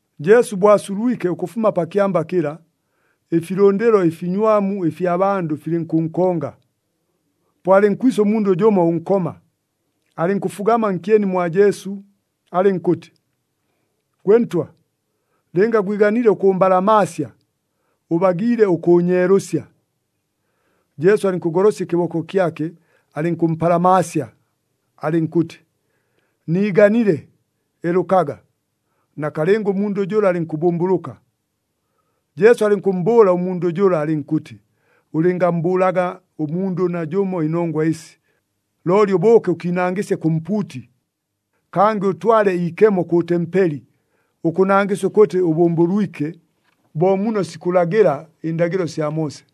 Jesu bo asulwike ʉkʉfuma pa kyamba kɨla, ɨfilʉndɨlo ɨfinywamu ɨfya bandʉ filɨnkʉnkonga. Po alɨnkwisa ʉmundʉ jʉmo ʉnkoma, alɨnkʉfugama nkyeni mwa Jesu, alɨnkʉtɨ, “Gwe Ntwa, lɨnga gwiganile ʉkʉmbalamaasya, ʉbagiile ʉkʉʉnyeelʉsya.” Jesu alɨnkʉgolosya ɨkɨboko kyake, alɨnkʉmpalamaasya, alɨnkʉtɨ, “Niiganile, elʉkaga!” Nakalɨnga ʉmundʉ jʉla alɨnkʉbʉmbʉlʉka. Jesu alɨnkʉmmbʉʉla ʉmundʉ jʉla alɨnkʉtɨ, “Ʉlɨngammbʉʉlaga ʉmundʉ najʉmo ɨnongwa ɨsi! Looli ʉbʉʉke ʉkiinangɨsye kʉ mpuuti. Kangɨ ʉtwale iikemo kʉ tempeli, ʉkʉnangɨsya ʉkʉtɨ ʉbʉmbʉlwike, bo muno sikʉlagɨla ɨndagɨlo sya Moose.”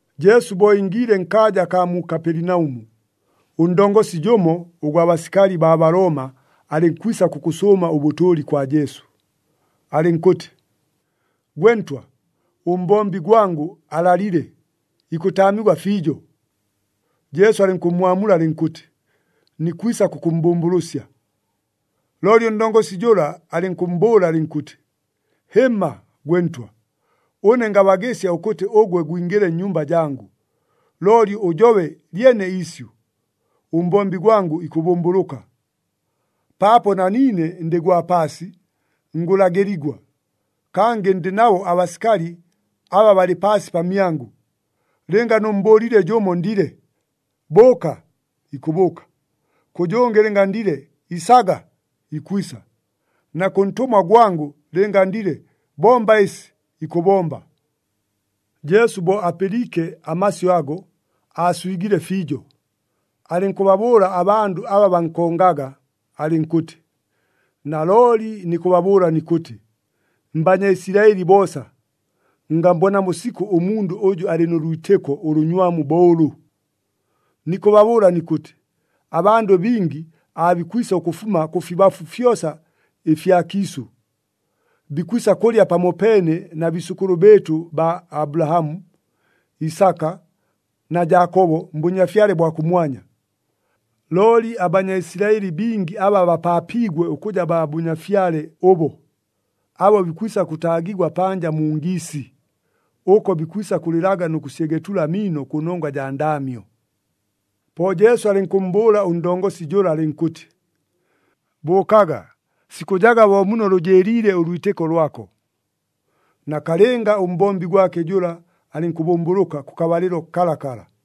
Jesu bo ingiile nkaaja akaa mu Kapelinaʉmu, ʉndongosi jʉmo ʉgwa basikali baa Balooma alɨnkwisa kʉkʉsʉʉma ʉbʉtʉʉli kwa Jesu, alɨnkʉtɨ, “Gwe Ntwa, ʉmbombi gwangʉ alalile, ikʉtaamigwa fiijo.” Jesu alɨnkʉmmwamula alɨnkʉtɨ, “Nikwisa kʉkʉmmbʉmbʉlʉsya.” Looli ʉndongosi jʉla alɨnkʉmmbʉʉla alɨnkʉtɨ, “Hɨmma, gwe Ntwa! Ʉne ngabagɨsya ʉkʉtɨ ʉgwe gwingɨle nnyumba jangʉ. Looli ʉjobe lyene iisyʉ, ʉmbombi gwangʉ ikʉbʉmbʉlʉka. Paapo na niine ndɨ gwa paasi, ngʉlagɨligwa, kangɨ ndɨ nabo abasikali aba balɨ paasi pamyangʉ. Lɨnga nʉmmbʉʉlile jʉmo ndile, ‘Bʉʉka!’ ikʉbʉʉka. Kʉ jʉngɨ lɨnga ndile, ‘Isaga!’ ikwisa. Na kʉ ntʉmwa gwangʉ lɨnga ndile, ‘Bomba ɨsi!’ ikʉbomba.” Jesu bo apɨliike amasyʉ ago, aaswigile fiijo, alɨnkʉbabʉʉla abandʉ aba bankongaga, alɨnkʉtɨ, “Nalooli nikʉbabʉʉla nikʉtɨ, mBanyaisilaɨli boosa, ngammbonamo sikʉ ʉmundʉ ʉjʉ alɨ nʉ lwitɨko ʉlʉnywamu bo ʉlʉ! Nikʉbabʉʉla nikʉtɨ, abandʉ bingi aabikwisa ʉkʉfuma kʉfibafu fyosa ɨfya kiisʉ. Bikwisa kʉlya pamopeene na biisʉkʉlʉ bɨɨtʉ baa Abulahamu, Isaka na Jaakobo mBʉnyafyale bwa kʉmwanya. Looli aBanyaisilaɨli bingi aba bapaapiigwe ʉkʉja baa Bʉnyafyale ʉbo, abo bikwisa kʉtaagigwa panja mu ngiisi, ʉko bikwisa kʉlɨlaga nʉ kʉsyegetula amiino kʉnongwa jaa ndaamyo.” Po Jesu alɨnkʉmmbʉʉla ʉndongosi jʉla alɨnkʉtɨ, “Bʉʉkaga! Sikʉjaga bo muno lʉjɨɨliile ʉlwitɨko lwako.” Nakalɨnga, ʉmbombi gwake jʉla alɨnkʉbʉmbʉlʉka kʉkabalɨlo kalakala.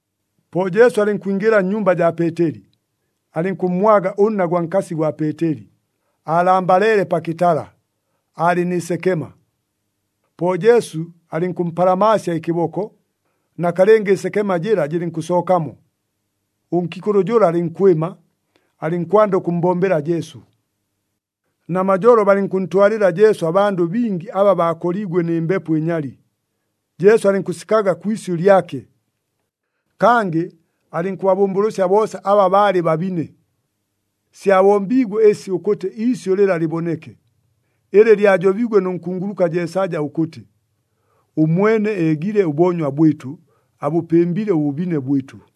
Po Jesu alɨnkwingɨla nnyumba jaa Peeteli, alɨnkʉmmwaga ʉnna gwa nkasi gwa Peeteli, aalambaleele pa kɨtala, aalɨ nɨ sekema. Po Jesu alɨnkʉmpalamaasya ɨkɨboko, nakalɨnga ɨsekema jɨla jɨlɨnkʉsookamo. Ʉnkiikʉlʉ jʉla alɨnkwɨma, alɨnkwanda ʉkʉmmbombela Jesu. Namajolo, balɨnkʉntwalɨla Jesu abandʉ bingi aba baakoliigwe nɨ mbepo ɨnyali, Jesu alɨnkʉsikaga kwi isyʉ lyake. Kangɨ alɨnkʉbabʉmbʉlʉsya boosa aba baalɨ babine. Syabombiigwe ɨsi ʉkʉtɨ iisyʉ lɨla lɨboneke, ɨlɨ lyajobiigwe nʉ nkunguluka Jeesaja ʉkʉtɨ, “Ʉmwene eegile ʉboonywa bwɨtʉ, abʉpɨmbile ʉbʉbine bwɨtʉ.”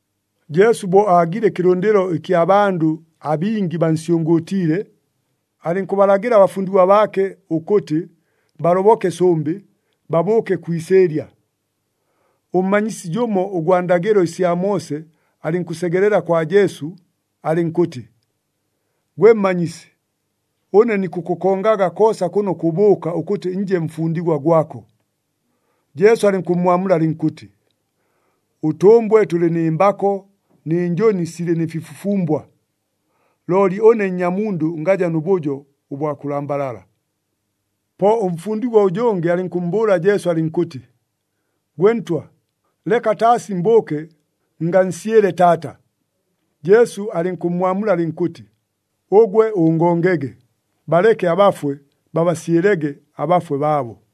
Jesu bo aagile ɨkɨlʉndɨlo ɨkya bandʉ abingi bansyʉngʉʉtiile, alɨnkʉbalagɨla abafundigwa baake ʉkʉtɨ, baloboke sʉmbɨ, babʉʉke kwi isɨɨlya. Ʉmmanyisi jʉmo ʉgwa ndagɨlo sya Moose alɨnkʉsegelela kwa Jesu, alɨnkʉtɨ, “Gwe Mmanyisi, ʉne nikʉkʉkongaga koosa kʉno kʉbʉʉka ʉkʉtɨ nje mfundigwa gwako!” Jesu alɨnkʉmmwamula alɨnkʉtɨ, “Ʉtʉmbwe tʉlɨ nɨ mbako nɨ njʉni silɨ nɨ fifufumbwa, looli ʉne Nnyamundʉ ngaja nʉ bʉjo ʉbwa kʉlambalala!” Po ʉmfundigwa ʉjʉngɨ alɨnkʉmmbʉʉla Jesu, alɨnkʉtɨ, “Gwe Ntwa, leka taasi mbʉʉke ngansyɨle taata.” Jesu alɨnkʉmmwamula alɨnkʉtɨ, “Ʉgwe ʉngongege! Baleke abafwe babasyɨlege abafwe baabo.”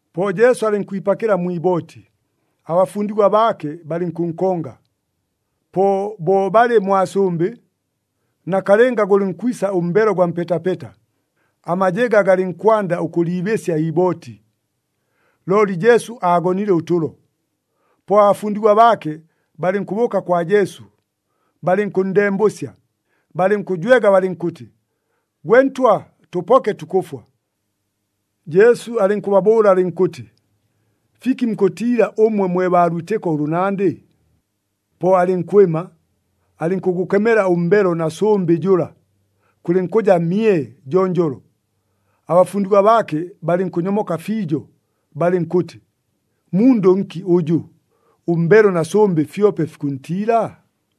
Po Jesu alɨnkwipakɨla mwi ibooti, abafundigwa baake balɨnkʉnkonga. Po bo balɨ mwa sʉmbɨ, nakalɨnga gʉlɨnkwisa ʉmbelo ʉgwa mpetapeta, amajɨga galɨnkwanda ʉkʉliibɨsya iibooti. Looli Jesu aagonile ʉtʉlo. Po abafundigwa baake balɨnkʉbʉʉka kwa Jesu, balɨnkʉnndembʉsya, balɨnkʉjwega balɨnkʉtɨ, “Gwe Ntwa! Tʉpoke, tukʉfwa!” Jesu alɨnkʉbabʉʉla alɨnkʉtɨ, “Fiki mukʉtiila ʉmwe mwe baa lwitɨko ʉlʉnandɨ?” Po alɨnkwɨma, alɨnkʉgʉkemela ʉmbelo na sʉmbɨ jʉla, kʉlɨnkʉja mye jonjolo. Abafundigwa baake balɨnkʉnyomoka fiijo, balɨnkʉtɨ, “Mundʉ nki ʉjʉ, ʉmbelo na sʉmbɨ fyope fikʉntiila?”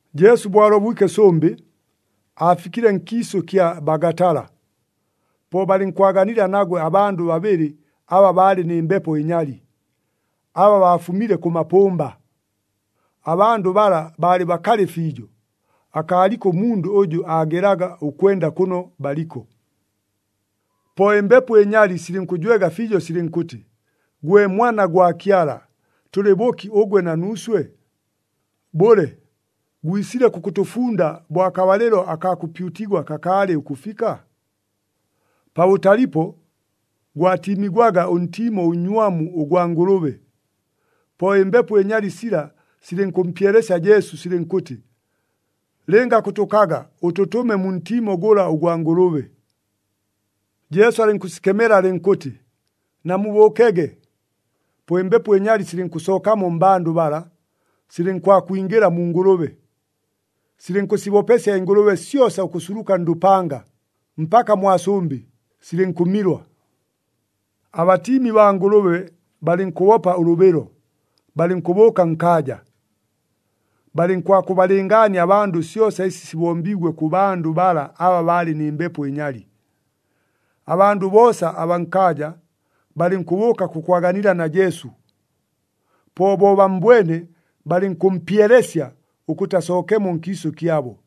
Jesu bo alobwike sʉmbɨ, aafikile nkiisʉ kya Bagatala. Po balɨnkwaganila nagwe abandʉ babɨlɨ aba baalɨ nɨ mbepo ɨnyali, aba baafumile kʉ mapʉmba. Abandʉ bala baalɨ bakalɨ fiijo, akaaliko ʉmundʉ ʉjʉ aagelaga ʉkwenda kʉno baliko. Po ɨmbepo ɨnyali silɨnkʉjwega fiijo silɨnkʉtɨ, “Gwe Mwana gwa Kyala, tʉlɨ bʉki ʉgwe na nuuswe? Bʉle, gwisile kʉkʉtʉfunda bo akabalɨlo akaa kʉpyutigwa kakaalɨ ʉkʉfika?” Pabʉtalipo, gwatiimigwaga ʉntiimo ʉnnywamu ʉgwa ngʉlʉbe. Po ɨmbepo ɨnyali sila silɨnkʉmpyelesya Jesu silɨnkʉtɨ, “Lɨnga kʉtʉkaga, ʉtʉtʉme mu ntiimo gʉla ʉgwa ngʉlʉbe.” Jesu alɨnkʉsikemela alɨnkʉtɨ, “Namubʉʉkege!” Po ɨmbepo ɨnyali silɨnkʉsookamo mmbandʉ bala, silɨnkwakwingɨla mu ngʉlʉbe. Silɨnkʉsibopesya ɨngʉlʉbe syosa ʉkʉsuluka ndʉpanga, mpaka mwa sʉmbɨ, silɨnkʉmilwa. Abatiimi baa ngʉlʉbe balɨnkʉbopa ʉlʉbɨlo, balɨnkʉbʉʉka nkaaja. Balɨnkwakʉbalɨngaania abandʉ syosa ɨsi sibombiigwe kʉ bandʉ bala aba baalɨ nɨ mbepo ɨnyali. Abandʉ boosa abaa nkaaja, balɨnkʉbʉʉka kʉkwaganila na Jesu. Po bo bammbwene, balɨnkʉmpyelesya ʉkʉtɨ asookemo nkiisʉ kyabo.